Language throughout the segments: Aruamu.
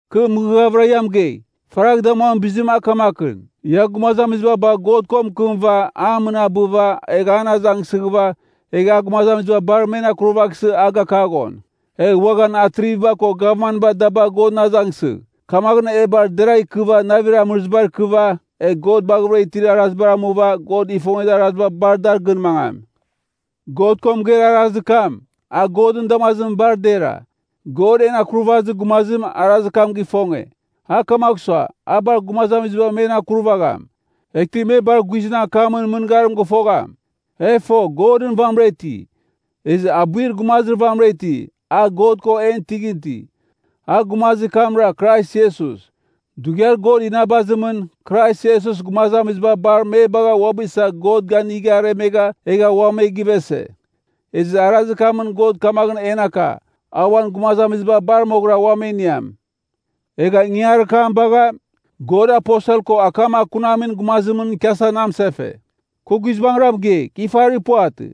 Kɨ mɨghɨghavɨra ia mɨgei, faragh damuamin bizim a kamakɨn, ia gumazamiziba bagh God ko mɨkɨmɨva a mɨnabɨva egh an azangsɨghɨva, egh a gumazamiziba bar men akurvaghsɨ a gakaghon. Egh uaghan atriviba ko gavmanba da bagh Godɨn azangsɨgh. Kamaghɨn, e bar deragh ikɨva navir amɨrɨzibar ikɨva, egh God baghavɨra itir arazibar amuva God ifongezir araziba bar dar gɨn mangam. God ko mɨgeir arazir kam, a Godɨn damazimɨn bar dera. God, en Akurvazir Gumazim, arazir kam gifonge. A kamagh sua, a bar gumazamiziba men akurvagham. Eghtɨ me bar guizɨn akamɨn mɨngarim gɨfogham. E fo, Godɨn vamɨra iti. Ezɨ abuir gumazir vamɨra iti, a God ko en tɨghɨn iti. A gumazir kamra, Krais Iesus. Dughiar God inabazimɨn, Krais Iesus gumazamiziba bar me bagha uabɨ isa God ganigha aremegha egha ua me givese. Ezɨ arazir kamɨn God kamaghɨn en aka, a uan gumazamiziba bar moghɨra ua me iniam. Egha ingangarir kam bagha, God aposel ko akam akunamin gumazimɨn ikiasa na mɨsefe. Kɨ guizbangɨra mɨgei, kɨ ifarir puvatɨ.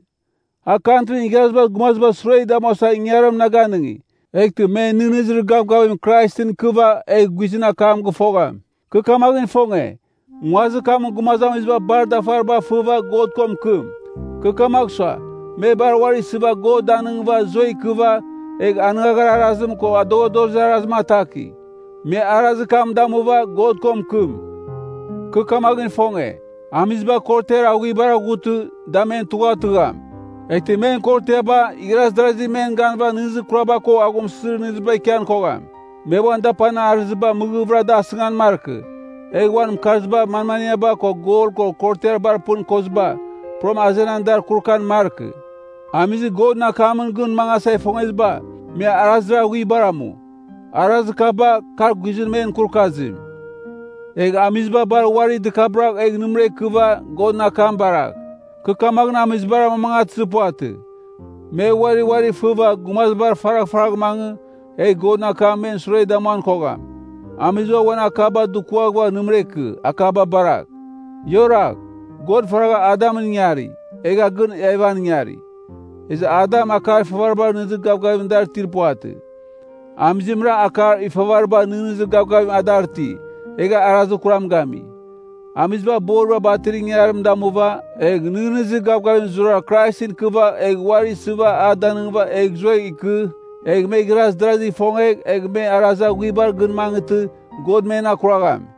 A Kantrin Igharazibar Gumazibar sure damuasa ingangarim na ganɨngi, eghtɨ me nɨghnɨzir gavgavim Kraisɨn ikɨva egh guizɨn akam gɨfogham. Kɨ kamaghɨn ifonge, nguazir kamɨn gumazamiziba bar dafariba fɨva God ko mɨkɨm. Kɨ kamagh sua, me bar uari isɨva God danɨngɨva zuegh ikɨva, egh anɨngagharir arazim ko adoghadozir arazim atakigh. Me arazir kam damuva, God ko mɨkɨm. Kɨ kamaghɨn ifonge, amiziba korotiar aghuibar aghutɨ, da men tugha tɨgham. Eghtɨ men korotiaba, igharaz darazi men ganɨva nɨghnɨzir kuraba ko aghumsɨzir nɨghnɨziba ikian kogham. Me uan dapanir arɨziba mɨghɨvɨra da asɨngan markɨ, egh uan mɨkarziba, manmaniaba ko gol ko korotiar bar pɨn koziba, puram azenan dar kurukan markɨ. Amizir Godɨn akamɨn gɨn mangasa ifongeziba, me arazir aghuibar amu. Arazir kaba, kar guizɨn men kurukazim. Egh amiziba bar uari dɨkabɨragh egh nɨmɨra ikɨva Godɨn akam baragh. Kɨ kamaghɨn amizibar amamangatɨzir puvatɨ, me uari uari fɨva gumazibar faraghfaragh mangɨ, egh Godɨn akamɨn men sure damuan kogham. Amiziba uan akaba dukuaghɨva nɨmɨra ikɨ akaba baragh. Ia oragh! God faragha Adamɨn ingari, egha gɨn Evan ingari. Ezɨ Adam akar ifavariba nɨghnɨzir gavgavim a dar itir puvatɨ. Amizimra akar ifavariba nɨghnɨzir gavgavim a dar iti, egha arazir kuram gami. Amiziba boriba batir ingangarim damuva, egh nɨghnɨzir gavgavim zurara Kraisɨn ikɨva egh uari isɨva a danɨngɨva egh zuegh ikɨ, egh me igharaz darazigh ifongegh, egh me arazir aghuibar gɨn mangɨtɨ, God men akuragham.